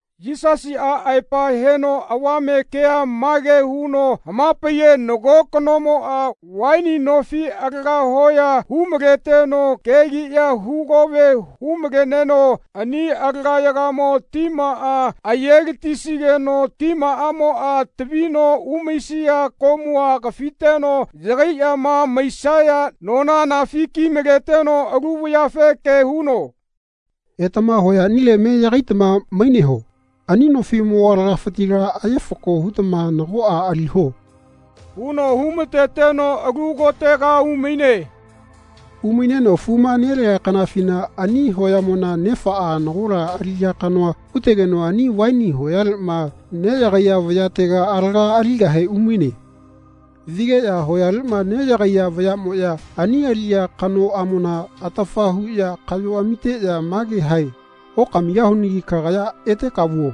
Yisasiꞌa aepa heno avame kea mage huno hamapaiye nago kanomoꞌa vaini nofi alaga hoya humaleteno kegiꞌya hugove humaleneno ani alagayagamo timaꞌa ayelatisigeno timaꞌamoꞌa tavino umaisia komua kafiteno yagaiꞌyama maisaya nona anafi kimaleteno alu vayafe ke huno “Etama hoyaꞌnile me yagaitama maineho. Ani nofiꞌmo alagafitila aye fako hutama nagoꞌa aliho.” huno humateteno alu kotega umaine. Umaineno fuma nelea kanafina ani hoyamona nefaꞌa nagola aliꞌya kanoa hutegeno ani vaini hoyaleꞌma neꞌyagaiya vayatega alaga aligahe umaine. Vigeꞌya hoyaleꞌma neꞌyagaiya vayaꞌmoꞌya ani aliꞌya kanoꞌamona atafa huꞌya kaꞌyo amiteꞌya mage hae “Okamigahunagi kagaya eteka vuo.”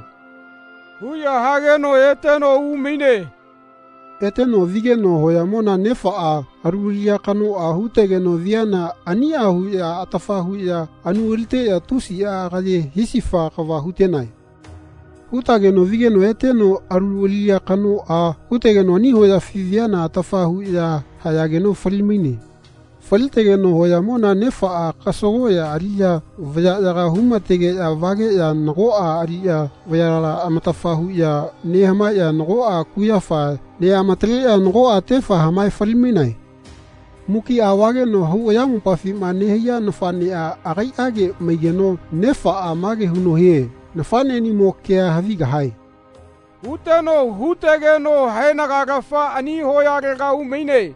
huꞌya hageno eteno umaine. Eteno vigeno hoyamona nefaꞌa alu aliꞌya kanoꞌa hutegeno viana aniꞌa huꞌya atafa huꞌya anu aliteꞌya tusiꞌa agaye hisifa kava hutenae. Hutageno vigeno eteno alu aliꞌya kanoꞌa hutegeno ani hoyafi viana atafa huꞌya hayageno falimaine. Falitegeno hoyamona nefaꞌa kasagoꞌya aliꞌya vayaꞌyaga humategeꞌya vageꞌya nagoꞌa aliꞌya vayala amatafa huꞌya nehamaeꞌya nagoꞌa kuyafa neꞌamataleꞌya nagoꞌa tefa hamae falimainae. Mukiꞌa vageno hau ayamopafima nehaiya nafaꞌneꞌa agaiꞌage maigeno nefaꞌa mage huno hie “Nafaꞌneꞌnimo kea havigahae.” huteno hutegeno haenagalafa ani hoyalega umaine.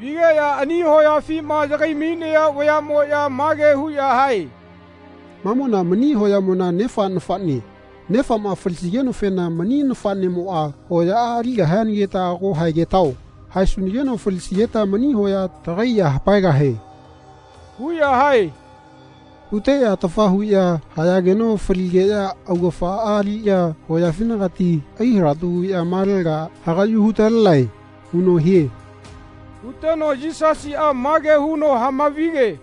Vigeꞌya ani hoyafima yagaimainaya vayaꞌmoꞌya mage huꞌya hae “Mamona mani hoyamona nefa nafaꞌne. Nefaꞌma falisigenofena mani nafaꞌnemoꞌa hoyaꞌa aligahianagita ago haegetao. Haesunageno falisigeta mani hoya tagai ya hapaegahie.” huꞌya hae. Huteꞌya atafa huꞌya hayageno faligeꞌya augafaꞌa aliꞌya hoyafinagati ai halatu huꞌya malaga hagaꞌyu hutalenae.” huno hie. Huteno Yisasiꞌa mage huno hamavige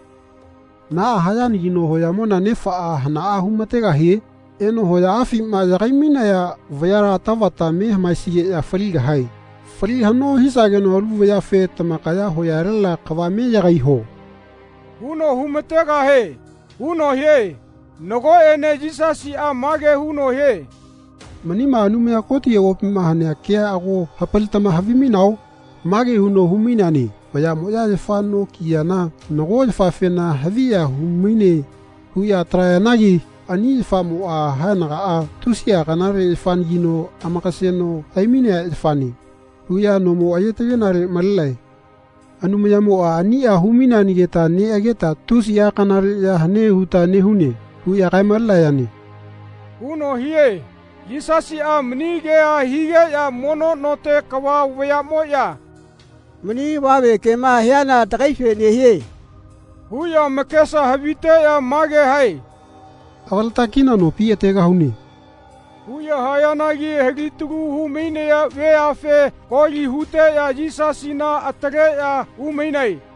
“Naꞌa hayanagino hoyamona nefaꞌa hanaꞌa humategahie? Eno hoyaꞌafima yagaimainaya vayala tavata me hamaesigeꞌya faligahae. Fali haꞌno hisageno alu vayafe “Tamakaya hoyalela kava me yagaiho.” huno humategahie.” huno hie. Nagoꞌene Yisasiꞌa mage huno hie “Manima Anumaya Koti avopima hanea kea ago hapalitama havimainao? Mage huno humaineane ‘Vayaꞌmoꞌya yafa noma kiyana nago yafafena ‘Haviya humaine.’ huꞌya atalayanagi ani yafamoꞌa haenagaꞌa ‘Tusiꞌa kanale yafanagino amakaseno haimainea yafane.’ huꞌya nomo ayetagenale malenae. Anumayamoꞌa aniꞌa humaineanagita neꞌageta tusiꞌa kanale ya hane huta nehune.’ huꞌya kaemalenayane.” huno hie. Yisasiꞌa mani kea higeꞌya mono note kava vayaꞌmoꞌya “Mani avame kema hiana tagaife nehie.” huꞌya amakesa haviteꞌya mage hae “Avaleta kina nopi ategahune.” huꞌya hayanagi alitalu humainaya veafe koli huteꞌya Yisasina ataleꞌya umainae.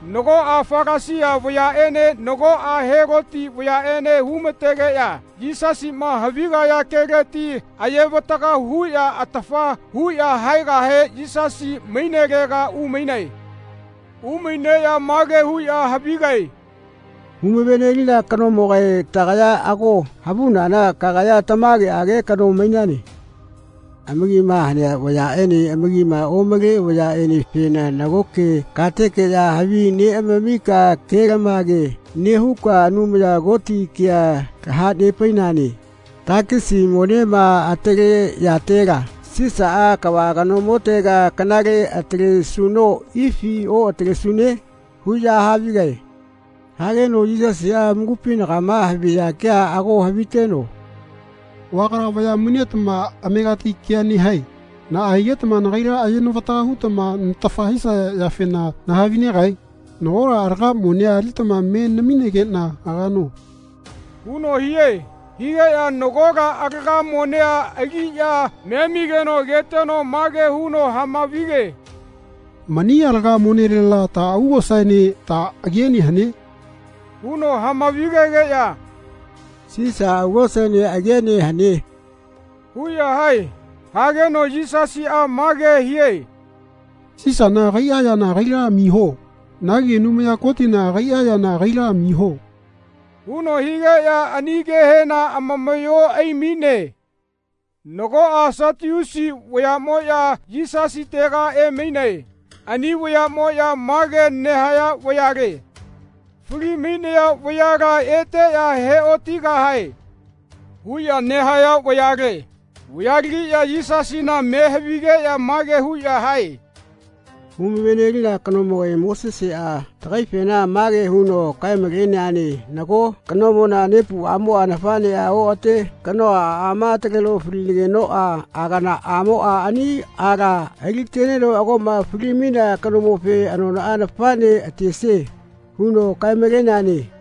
Nagoꞌa Falasia vayaꞌene nagoꞌa Heloti vayaꞌene humatageꞌya Yisasiꞌma havigaya keleti ayevataga huꞌya atafa huꞌya haegahe Yisasi mainelega umainae. Umaineꞌya mage huꞌya havigae “Humavenelina kanomogae tagaya ago havunana kagaya tamageꞌage kano mainane. Amakima hanea vayaꞌene amakima omale vayaꞌenefena nagoke katekeꞌya havi neꞌamamika kelamage nehuka Anumaya Koti kea tahanepainane. Takisi monema ataleyatela Sisaꞌa kava kanomotega kanale atalesuno ifi oꞌatalesune? huꞌya havigae. Hageno Yisasiꞌa amakupinagama haviya kea ago haviteno “Vagala vaya mainetama amegati ke nehae. Naꞌa higetama nagaila ayenavataga hutama natafa hisaya yafena nahavinegae? Nagola alaga monea alitama me namigeꞌna agano.” huno hie. Higeꞌya nagola alaga monea aliꞌya memigeno ageteno mage huno hamavige “Mani alaga monelela ta augosaene ta agiene hane?” huno hamavigegeꞌya “Sisa augosaene agiene hane.” huꞌya hae. Hageno Yisasiꞌa mage hie “Sisana agaiꞌa yana agaila amiho. Nagi Anumaya Kotina agaiꞌa yana agaila amiho.” huno higeꞌya ani kehena amamaꞌyo aimaine. Nagoꞌa Satiusi vayaꞌmoꞌya Yisasitega emainae. Ani vayaꞌmoꞌya mage nehaya vayale “Falimainaya vayala eteꞌya heotigahae.” huꞌya nehaya vayale. Vayalegiꞌya Yisasina me havigeꞌya mage huꞌya hae “Humavenelina kanomogae Moseseꞌa tagaifena mage huno kaemaleneane ‘Nago kanomona nepuꞌamoꞌa nafaꞌneꞌa oꞌate kanoa aꞌama ataleno falinagenoꞌa aganaꞌamoꞌa ani aala aliteneno agoꞌma falimainea kanomofe anonaꞌa nafaꞌne atesie.’ huno kaemaleneane.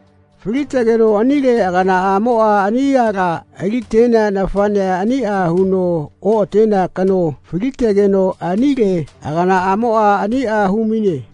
Falitegeno anile aganaꞌamoꞌa ani aala aliteana nafaꞌnea aniꞌa huno oꞌatenea kano falitegeno anile aganaꞌamoꞌa aniꞌa humaine.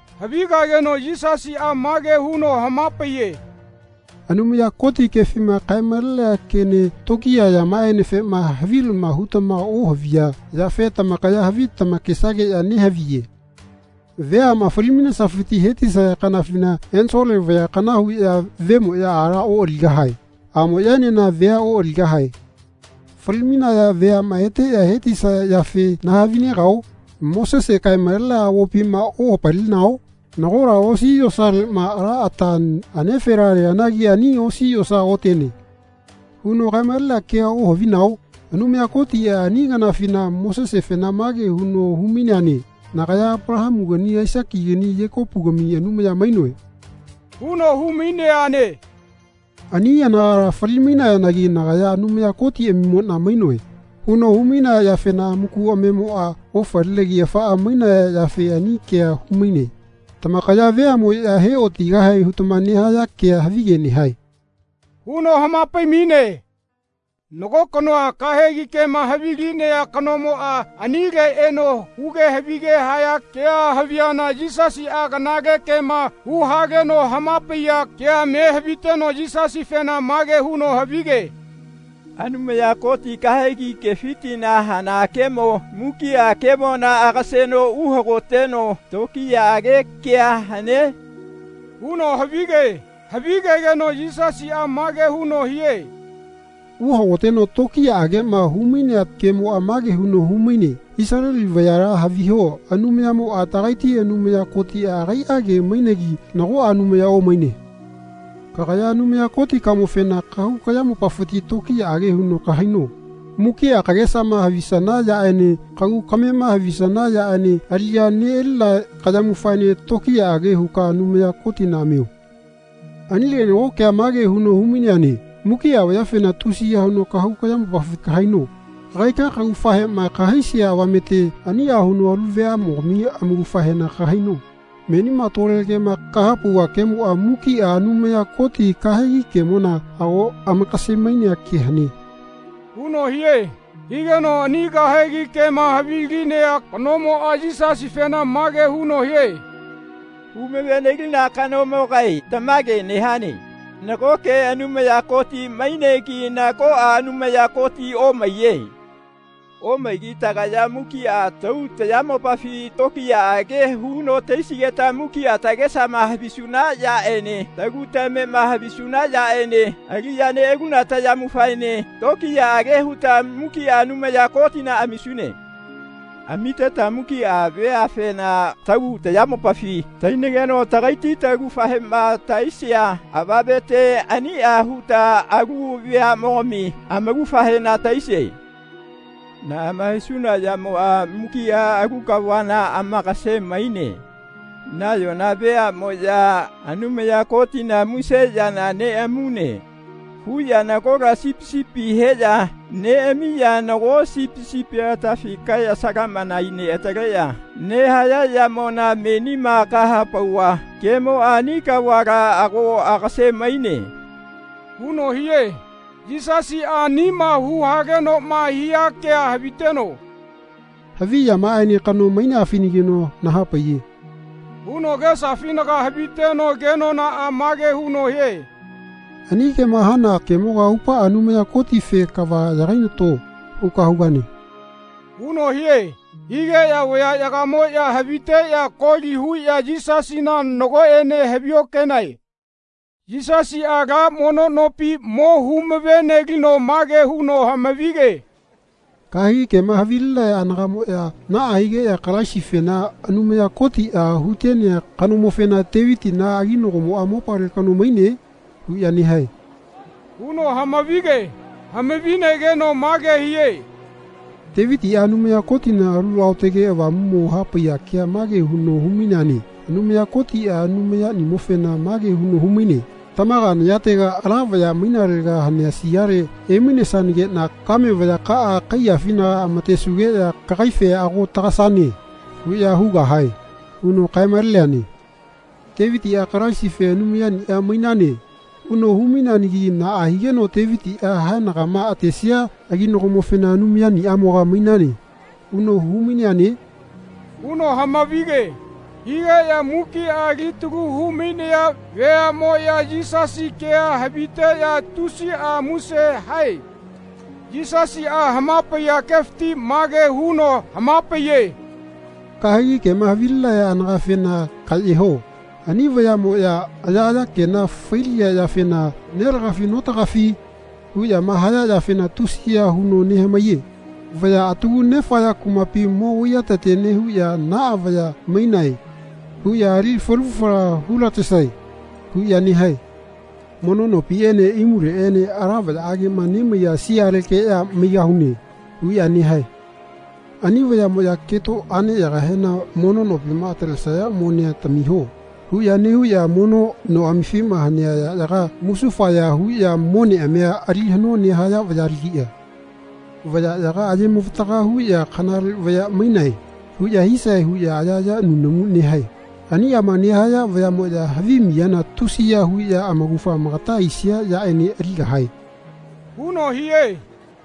Havigageno Yisasiꞌa mage huno hamapaiye “Anumaya Koti kefima kaemalenea kene tokiya yamaꞌaenefena havilama hutama ohaviya yafe tamakaya havi tamakesageꞌya nehaviye. Veaꞌma falimainesafiti hetisaya kanafina ensole vaya kana huꞌya vemoꞌya aala oꞌaligahae. Aꞌmoꞌyaenena vea oꞌaligahae. Falimainaya veaꞌma eteꞌya hetisaya yafe nahavinegao? Mosese kaemalenea avopima ohapalinao? Nagola osi yosaleꞌma ala ata anefela leanagi ani osi yosa otene.” huno kaemalenea kea ohavinao? Anumaya Kotiꞌa ani kanafina Mosesefena mage huno humaineane “Nagaya Apalahamunagi Aisakinagi Yekopugami Anumaya mainoe.” huno humaineane. Ani anagala falimainayanagi “Nagaya Anumaya Kotiꞌamimoꞌna mainoe.” huno humainea yafena amaku amamemoꞌa ofalinegi afaꞌa mainaya yafe ani kea humaine. Tamakaya veaꞌmoꞌya heꞌotigahae hutama nehaya kea havige nehae.” huno hamapaimaine. Nago kanoa kahegi kema havilinea kanomoꞌa anile eno huge havige haya kea haviana Yisasiꞌa kanale kema huhaleno hamapaiya kea me haviteno Yisasifena mage huno havige “Anumaya Koti kahegi kefitila hana kemo mukiꞌa kemona agaseno uhagoteno tokiyaꞌage kea hane?” huno havige. Havige-geno Yisasiꞌa mage huno hie “Uhagoteno tokiyaꞌageꞌma humainea kemoꞌa mage huno humaine ‘Isaleli vayala haviho Anumayamoꞌa tagaiti Anumaya Kotiꞌa agaiꞌage mainegi nagoꞌa Anumaya omaine. Kagaya Anumaya Kotikamofena kahau kayamopafina tokiyaꞌage huno kahaino. Mukiꞌa kagesama havisana yaꞌene kagu kamema havisana yaꞌene aliꞌya neꞌalina kayamufaene tokiyaꞌage huka Anumaya Kotina amio.’ Anile nago kea mage huno humaineane ‘Mukiꞌa vayafena tusiya huno kahau kayamopafi kahaino. Kagaika kaugafahema kahaisia avamete aniꞌa huno alu veaꞌmogami amaugafahena kahaino.’ Menima tole kema kahapauva kemoꞌa mukiꞌa Anumaya Koti kahegi kemona ago amakasemainea ke hane.” huno hie. Higeno ani kahegi kema havilinea kanomoꞌa Yisasifena mage huno hie “Humavenelina kanomogae tamage nehane. Nagoke Anumaya Koti mainegi nagoꞌa Anumaya Koti omaiye. Omaigi tagaya mukiꞌa tahau tayamopafi tokiyaꞌage huno tahaisigeta mukiꞌa tagesama havisuna yaꞌene tagu tamema havisuna yaꞌene aliꞌya neꞌaluna tayamufaene tokiyaꞌage huta mukiꞌa Anumaya Kotina amisune. Amiteta mukiꞌa veafena tahau tayamopafi tahainageno tagaiti laugafahema tahaisia avamete aniꞌa huta alu veaꞌmogami amaugafahena tahaisie. Naꞌama hisuna yamoꞌa mukiꞌa alu kavala amakasemaine. Nayona veaꞌmoꞌya ‘Anumaya Kotina muse yana neꞌamune.’ huꞌya nagola sipi sipi heꞌya neꞌamiꞌya nago sipi sipia atafi kae salaꞌmana aineꞌataleꞌya nehaya yamona menima kahapauva kemoꞌa ani kavala ago agasemaine.” huno hie. Yisasiꞌa anima huhalenoꞌma hia kea haviteno “Haviꞌyamaꞌaene kano maineafenagino nahapaiye.” huno agesafinaga haviteno kenonaꞌa mage huno hie “Ani kema hana kemoga aupaꞌa Anumaya Kotife ‘Kava yagainato.’ huka hugane.” huno hie. Higeꞌya vayaꞌyagamoꞌya haviteꞌya koli huꞌya Yisasina nagoꞌene haviokenae. Yisasiꞌa ala mono nopi mo humavenelino mage huno hamavige “Kahegi kema havilinaya anagaꞌmoꞌya naꞌa higeꞌya Kalaisifena, ‘Anumaya Kotiꞌa hutenea kanomofena Tevitina aginagomoꞌa mopale kano maine?’ huꞌya nehae.” huno hamavige. Hamavinegeno mage hie “Tevitiꞌa Anumaya Kotina Alu Aotage Avamumo hapaiya kea mage huno humaineane ‘Anumaya Kotiꞌa Anumaya-niꞌamofena mage huno humaine ‘Tamaga nayatega, ala vaya mainalega hanea siale emainesanageꞌna kame vayakaꞌa kaiyafinaga amatesugeꞌya kagaife ‘Ago tagasane.’ huꞌya hugahae.’ huno kaemaleneane. Tevitiꞌa Kalaisife ‘Anumayaniꞌa mainane.’ huno humainegi naꞌa higeno Tevitiꞌa haenagama atesia aginagomofena ‘Anumayaniꞌamoga mainane.’ huno humaineane?” huno hamavige. Higeꞌya mukiꞌa alitalu humainaya veaꞌmoya Yisasi kea haviteꞌya tusiꞌa muse hae. Yisasiꞌa hamapaiya kefiti mage huno hamapaiye “Kahegi kema havilinaya anagafena kaꞌyeho. Ani vayaꞌmoꞌya ayaꞌaya kena failiya yafena ‘Nelagafi notagafi?’ huꞌyama haya yafena tusiya huno nehamaiye. Vaya atagu nefaya kumapi mo vaiyatete nehuꞌya ‘Naꞌa vaya mainae.’ huꞌya ‘Ali falu fala hulatesae.’ huꞌya nehae. Mono nopiꞌene imuleꞌene ‘Ala vayaꞌageꞌma nemaiya sialekeꞌya maigahune.’ huꞌya nehae. Ani vayaꞌmoꞌya keto aꞌneyagahena ‘Mono nopima atalesaya monea tamiho.’ huꞌya nehuꞌya noꞌamifima hanea yaꞌyaga musufaya huꞌya moneꞌamia ali haꞌno nehaya vayalagiꞌya. Vayaꞌyaga ayemavataga huꞌya ‘Kanale vaya mainae.’ huꞌya hisae huꞌya ayaꞌaya nunamu nehayane. Aniꞌama nehaya vayaꞌmoꞌya havi miyana tusiya huno amaugafa amagata aisia yaꞌene aligahae.” huno hie.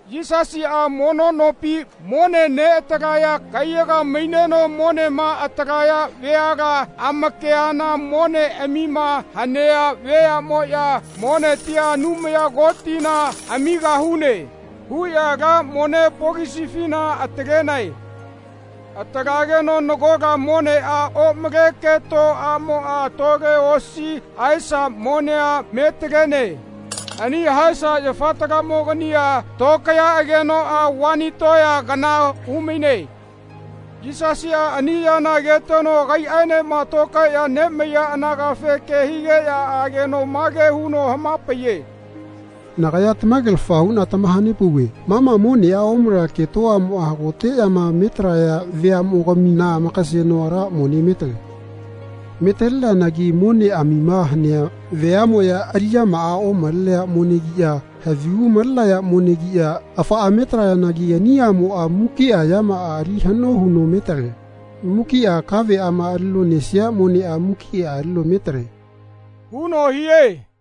Yisasiꞌa mono nopi mone neꞌatalaya kaiyaga maineno monema atalaya veala amakeana moneꞌamima hanea veaꞌmoꞌya “Monetia Anumaya Kotina amigahune.” huꞌya ala mone pokisifina atalenae. Atalageno nagola moneꞌa omale keto aꞌmoꞌa tole osi haesa monea metalene. Ani haesa yafatalamogania tokayaꞌagenoꞌa vani toya kana humaine. Yisasiꞌa ani yana ageteno agaiꞌaenema tokaeꞌya nemaiya anagafe ke higeꞌya ageno mage huno hamapaiye “Nagaya tamagelafa huꞌna tamahanepauve ma ma moneꞌa omale keto aꞌmoꞌa hagoteꞌyama metalaya veaꞌmogamina amakaseno ala mone metale. Metaleneanagi moneꞌamima hanea veaꞌmoꞌya aliꞌyamaꞌa omalenea monegiꞌya havigu malenaya monegiꞌya afaꞌa metalayanagi ani aꞌmoꞌa mukiꞌa yamaꞌa ali haꞌno huno metale. Mukiꞌa kaveꞌama alino nesia moneꞌa mukiꞌa alino metale.” huno hie.